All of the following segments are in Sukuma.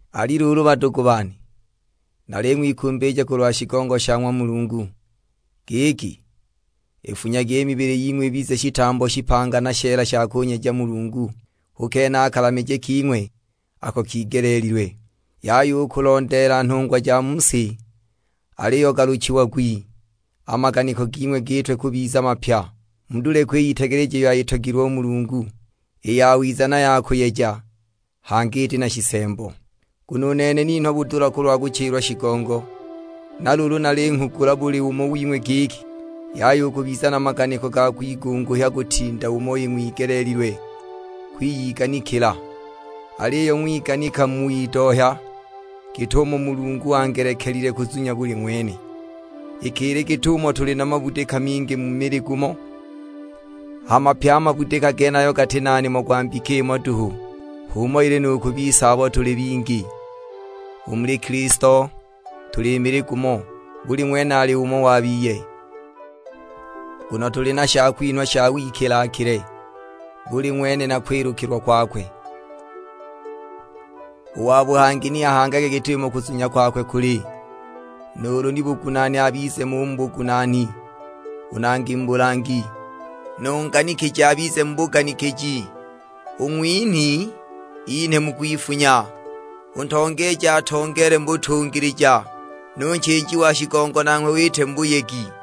Ali luulu badugu bane, naling'wikumbilija kulwa shigongo sha ng'wa Mulungu; giki, ifunyagi i mibili ying'we ibize shitambo shipanga na sheela sha kunyeja Mulungu, hu kene a kalamije king'we ako kigeleelilwe. Yaya u kulondeela nhungwa ja mu si, aliyo galuchiagwi; a maganiko ging'we gitwe kubiza mapya. Mudule kwiyitegeleja iyo ayitogilwe u Mulungu; i yawiza na ya kuyeja, hangi iti na shisembo. Nguno u nene ninhwa budula kulwa kuchilwa shigongo; na luulu nalinghugula buli umo wing'we giki, yaya u kubiza na maganiko ga kwigunguhya kutinda umo ing'wigeleelilwe kwiyiganikila, aliyo ng'wiganika mu widohya, git'umo Mulungu angelekelile kuzunya buli ng'wene. Iki ili git'umo tuli na mabudika mingi mu mili gumo, hama pye a mabudika genayo gati na nimo gwa mbika imo duhu; H'umo ili nu ku bise abo tuli bingi; u muli Kilisto tuli mili gumo, buli ng'wene ali umo wa biye. Nguno tuli na shakwinhwa sha wikila-kile, buli ng'wene na kwilukilwa kwakwe; u wa buhangi ni ahangage git'umo kuzunya kwakwe kuli. Nuulu ni bugunaani abize mo u mu bugunaani, u nangi mu bulangi; nu nganikiji abize mu buganikiji, u ng'winhi inhe mu kwifunya, u ntongeeji atongeele mu butungilija, nu nchiiji wa shigongo nanghwe iite mu buyegi.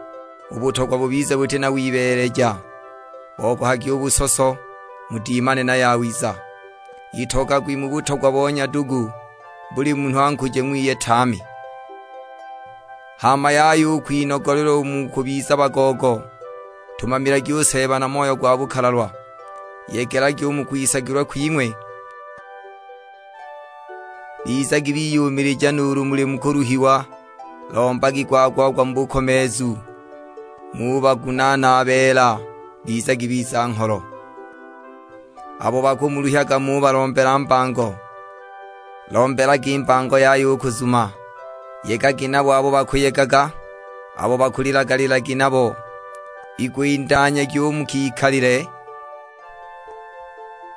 U butogwa bubize buti na wibeeleja, bogohagi u busoso, mudimane na yawiza. Itogagwi mu butogwa bo nyadugu, buli munhu ankuje ng'wiye tame. Hama yaya u kwinogolelwa u mu kubiza bagoogo, ntumamilagi u Seeba na moyo gwa bukalalwa. Yegelagi u mu kwisagilwa kwing'we, bizagi biyumilija nuulu muli mu kuluhiwa, lombagi gwa-gwa-gwa mu bukomeezu. Ng'ubagunaana a beela, bizagi biza-ngholo. Abo bakumuluhyaga ng'ubalombela mbango, lombelagi mbango yaya u kuzuma. Yegagi nabo abo bakuyegaga, abo bakulilaga lilagi nabo. Igwindanyagi u mu kikalile,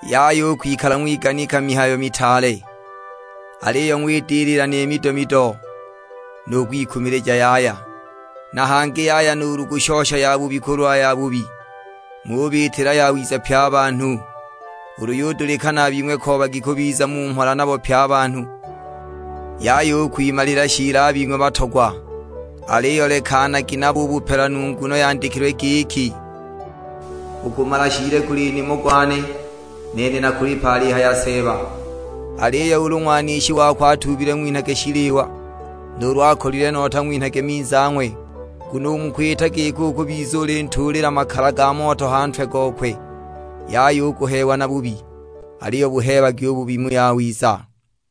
yaya u kwikala ng'wiganika mihayo mitaale, aliyo ng'widilila ni mido-mido; nu kwikumilija yaya. Na hangi yaya nuulu kushosha yabubi kulwa yabubi; ng'ubiitila yawiza pye a banhu. Ulu yudulikana a bing'we koobagi kubiza mu mhola nabo pye a banhu. Yaya u kwimalila shiili a bing'we batogwa, aliyo lekanagi nabo u bupelanu, nguno yandikilwe giki, "U kumala shiili guli nimo gwane, nene nakulipa," alihaya Seeba. Aliyo ulu ng'wanishi wako atuubile ng'winhage shiliwa, nuulu akolilwe nota ng'winhage minzi ang'we; nguno u mu kwita giko ukubiza ulintuulila makala ga moto a ha ntwe gokwe. Yaya u kuheewa na bubi, aliyo buheebagi u bubi mu yawiza.